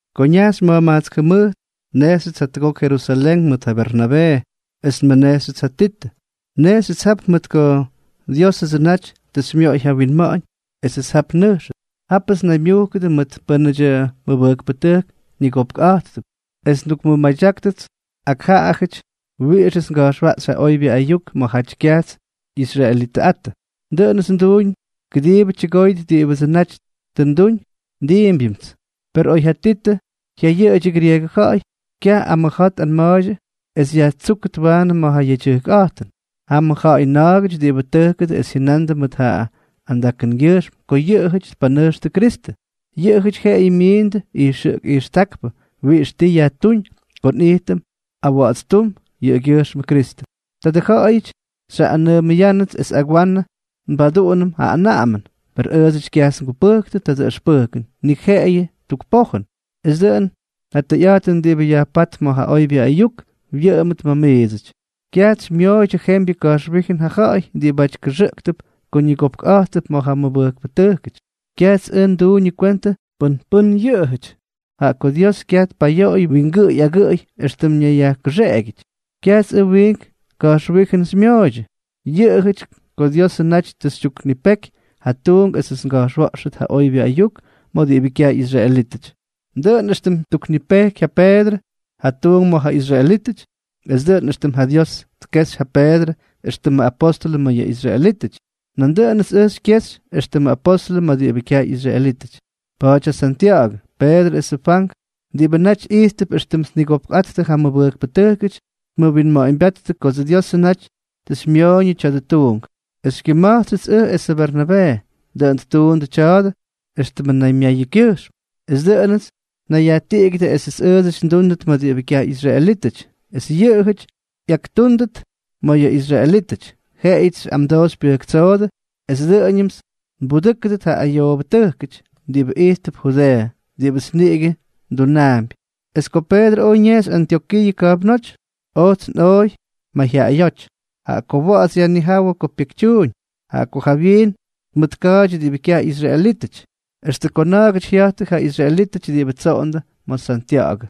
Ko ñajxy ma̱jma̱jkts jʉmʉjt, nnejxyʉts jatʉgok Jerusalén mʉt ja Bernabee, es nmʉnejxyʉts ja Titʉ. Nnejxyʉts jap mʉt ko Diósʉdsʉ naty tʉ xymyoꞌoy ja winma̱ꞌa̱ñ esʉts jap nnʉjxʉt. Jápʉts nnaymyujkʉdʉ mʉt pʉ́nʉdyʉ mʉbʉjkpʉtʉjk ñigopkꞌa̱jttʉp, es ndukmʉmadyákyʉts ak jaꞌajʉty wiꞌixʉts nga̱jxwaꞌxy ja oybyʉ ayuk ma̱jaty kyaj ꞌyisraelítʉty. Dʉꞌʉnʉts nduuñ kʉdiibʉ tyʉgóyʉt diꞌibʉdsʉ naty tʉ nduñ es ndiimpyñʉmts. Per oy ja Titʉ jyayʉꞌʉdyʉ grieegʉ ja̱ꞌa̱y, kyaj amʉja̱a̱ tꞌanma̱a̱ydyʉ es yajtsúkʉt waanʉ ma̱ yʉ yedyʉjkꞌa̱jtʉn. Jam ja ja̱ꞌa̱y na̱a̱gʉty diꞌibʉ tʉjkʉdʉ es jyʉnandʉ mʉt ja andakʉngyʉjxm ko yʉꞌʉjʉty tpanʉjxtʉ Kristʉ. Yʉꞌʉjʉty jeꞌeyʉ myindʉ ijxʉꞌk ijxtákpʉ wiꞌix ti yajtúñ ko nꞌijtʉm awa̱ꞌa̱dstúm yʉꞌʉgyʉjxmʉ Kristʉ. Tadʉ ja̱ꞌa̱yʉty xyjaꞌꞌanʉʉmʉyánʉts es agwanʉ nbaduꞌunʉm ja anaꞌamʉn. Per ʉʉdsʉty kyajts ngupʉjktʉ tadʉ ʉxpʉjkʉn, ni jeꞌeyʉ tuk pojʉn, es dʉꞌʉn ja tʉyꞌa̱jtʉn diꞌibʉ yajpátp ma̱ ja oybyʉ ayuk wyʉꞌʉmʉt ma̱ miidsʉty. Kyajts xymyooydyʉ jembyʉ ka̱jxwíjʉn ja ja̱ꞌa̱y diꞌibʉty kʉxʉꞌktʉp ko ñigopkꞌa̱jttʉp ma̱ ja mʉbʉjkpʉtʉjkʉty. Kyajts ʉj nduñʉ kwentʉ pʉn pʉ́n yʉꞌʉjʉty, jaꞌa ko Dios kyaj tpayoꞌoy wingʉꞌʉy agʉꞌʉy éxtʉm ñayyajkʉxeꞌegyʉty. Kyajts ʉj wiink ka̱jxwíjʉn xymyooydyʉ, yʉꞌʉjʉty ko Diósʉdsʉ naty tʉ xytyuknipeky ja tuunk esʉts nga̱jxwa̱ꞌxʉt ja oybyʉ ayuk ma̱ diꞌibʉ kyaj ꞌyisraelítʉty, dʉꞌʉn éxtʉm ttuknipejky ja Peedrʉ ja tuunk ma̱ ja israelítʉty. Es dʉꞌʉn éxtʉm ja Dios tkejxy ja Peedrʉ éxtʉmʉ apóstʉlʉ ma̱ yʉ israelítʉty, nandʉꞌʉnʉts ʉj xykyejxy éxtʉmʉ apóstʉlʉ ma̱ diꞌibʉ kyaj ꞌyisraelítʉty. Pa̱a̱ty ja Santya̱ꞌa̱gʉ, Peedrʉ es ja Fwank, diꞌibʉ naty ijttʉp éxtʉm tnigopkꞌattʉ ja mʉbʉjkpʉtʉjkʉty, tmʉwinma̱ꞌa̱ñbyáttʉ kots Diosʉ naty tʉ xymyoꞌoyʉ tya̱dʉ tuunk, es xykyʉma̱jtsyʉts ʉj esʉ Bernabee. Dʉꞌʉn ttuundʉ tya̱a̱dʉ éxtʉm naymyayʉkyʉjxm, es dʉꞌʉnʉts nnayyajtiꞌigyʉdʉ esʉts ʉʉdsʉty ndúndʉt ma̱ diꞌibʉ kyaj ꞌyisraelítʉty, es yʉꞌʉjʉty ꞌyaktúndʉt ma̱ yʉ israelítʉty. Jeꞌeyʉts xyꞌamdoo xypyʉjktsoodʉ es dʉꞌʉñʉmts nbudʉ́kʉdʉt ja ayoobʉtʉjkʉty diꞌibʉ ijttʉp Judeeʉ, diꞌibʉts niꞌigʉ ndunaampy. Es ko Peedrʉ oj ñejxy Antyokiiʉ ka̱jpnóty, ojts nꞌooy mayjyaꞌayóty, jaꞌa ko wa̱ꞌa̱ts yajnijáwʉ ko pyekytyuuñ. Jaꞌa ko jawyiin tmʉtka̱a̱ydyʉ diꞌibʉ kyaj ꞌyisraelítʉty, extʉ ko na̱a̱gʉty jya̱jttʉ ja israelítʉty diꞌibʉ tsoꞌondʉ ma̱ Santya̱ꞌa̱gʉ;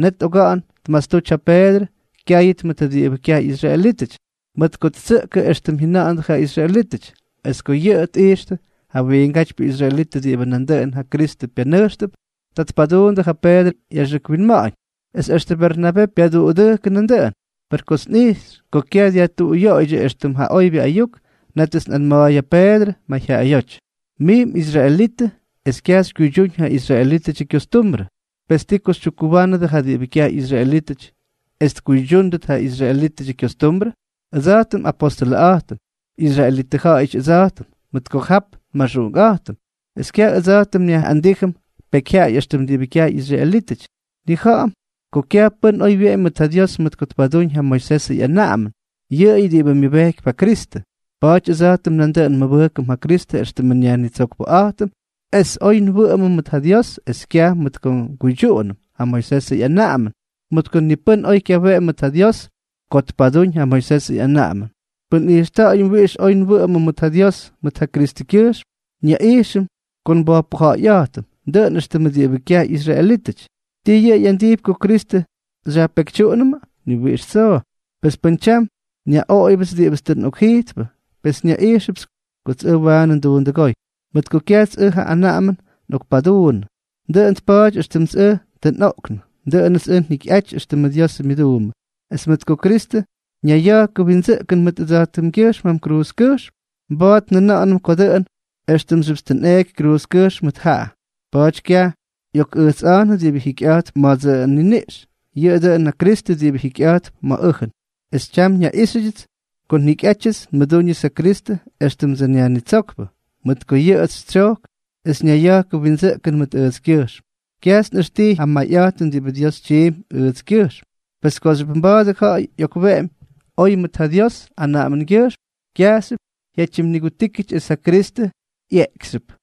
net oga̱ꞌa̱n tmastuty ja Peedrʉ kyáyʉt mʉt diꞌibʉ kyaj ꞌyisraelítʉty, mʉt ko ttsʉꞌkʉ éxtʉm jyʉna̱ꞌa̱ndʉ ja israelítʉty. Es ko yʉꞌʉ tꞌijxtʉ ja wiingátypyʉ israelitʉ diꞌibʉ nandʉꞌʉn ja Kristʉ pyanʉjxtʉp, ta tpaduundʉ ja Peedrʉ ꞌyaxʉk winma̱ꞌa̱ñ, es extʉ Bernabee pyaduꞌudʉjkʉ nandʉꞌʉn. Per kots nꞌijxy ko kyaj dyajtuꞌuyoꞌoydyʉ éxtʉm ja oybyʉ ayuk, nétʉts nꞌanma̱a̱y ja Peedrʉ mayjyaꞌayóty: “Mij mꞌisraelitʉ, es kyaj xykyuydyúñ ja israelítʉdyʉ kyostumbrʉ, pes, ¿ti ko xytyukkuwánʉdʉ ja diꞌibʉ kyaj ꞌyisraelítʉty es tkuydyúnʉt ja israelítʉdyʉ kyostumbrʉ?” Ʉdsa̱jtʉm apóstʉlʉꞌa̱jtʉm, israelitʉ ja̱ꞌa̱yʉty ʉdsa̱jtʉm mʉt ko jap nmaxuꞌunkꞌa̱jtʉm, es kyaj ʉdsa̱jtʉm nyaꞌꞌandíjʉm pekyjyaꞌay éxtʉm diꞌibʉ kyaj ꞌyisraelítʉty, nnija̱ꞌa̱m ko kyaj pʉ́n oy wyeꞌemy mʉt ja Dios mʉt ko tpadúñ ja Moisesʉ ꞌyanaꞌamʉn, yʉꞌʉyʉ diꞌibʉ myʉbejkypy ja Kristʉ. Pa̱a̱ty ʉdsa̱jtʉm nandʉꞌʉn nmʉbʉjkʉm ja Kristʉ éxtʉmʉ nYajnitsokpʉꞌa̱jtʉm es oy nwʉꞌʉmʉm mʉt ja Dios, es kyaj mʉt ko nguydyuꞌunʉm ja Moisesʉ ꞌyanaꞌamʉn, mʉt ko ni pʉ́n oy kyaweꞌemy mʉt ja Dios ko tpadúñ ja Moisesʉ ꞌyanaꞌamʉn. Pʉn nꞌijxta̱ꞌa̱yʉm wiꞌix oy nwʉꞌʉmʉm mʉt ja Dios mʉt ja Kristʉkyʉjxm, nyaꞌijxʉm ko nbojpʉja̱ꞌa̱yꞌa̱jtʉm, dʉꞌʉn éxtʉmʉ diꞌibʉ kyaj ꞌyisraelítʉty. ¿Ti yʉꞌʉ ꞌyandijpy ko Kristʉ xyajpekytyuꞌunʉmʉ? ¡Ni wiꞌix tsoo! Pes pʉn tyam nyaꞌoꞌoyʉpts diꞌibʉts tʉ nꞌokjijtpʉ, pes nyaꞌijxʉpts kots ʉj tʉ waanʉ nduundʉgóy. Mʉt ko kyajts ʉj ja anaꞌamʉn nꞌokpaduunnʉ, dʉꞌʉn tpa̱a̱ty éxtʉmts ʉj tʉ nꞌoꞌknʉ, dʉꞌʉnʉts ʉj njikyꞌaty éxtʉmʉ Diosʉ myʉduumbʉ, es mʉt ko Kristʉ ñayya̱jkʉ windsʉꞌkʉn mʉt ʉjtskyʉjxm jam kruuzkʉjxm, mba̱a̱t njʉna̱ꞌa̱nʉm ko dʉꞌʉn éxtʉmxyʉpts tʉ nꞌeeky kruuzkʉjxm mʉt jaꞌa. Pa̱a̱ty kyaj ꞌyokꞌʉjtsꞌa̱jnʉ diꞌibʉ jikyꞌa̱jtp ma̱dsʉ nniniꞌx, yʉꞌʉ dʉn ja Kristʉ diꞌibʉ jikyꞌa̱jtp ma̱ ʉjʉn, es tyam nyaꞌíxyʉdyʉts ko njikyꞌátyʉts nmʉdúñʉts ja Kristʉ éxtʉmdsʉ nYajnitsókpʉ, mʉt ko yʉꞌʉts xytsyojk es ñayya̱jkʉ windsʉꞌkʉn mʉt ʉjtskyʉjxm. Kyajts nꞌʉxtijy ja mayꞌa̱jtʉn diꞌibʉ Dios tyiimpy ʉjtskyʉjxm, pes kooxyʉp mba̱a̱dʉ ja̱ꞌa̱y ꞌyokweꞌemy oy mʉt ja Dios anaꞌamʉngyʉjxm, kyajxyʉp jyatyimnigutíkyʉty es ja Kristʉ ꞌyeekyxyʉp.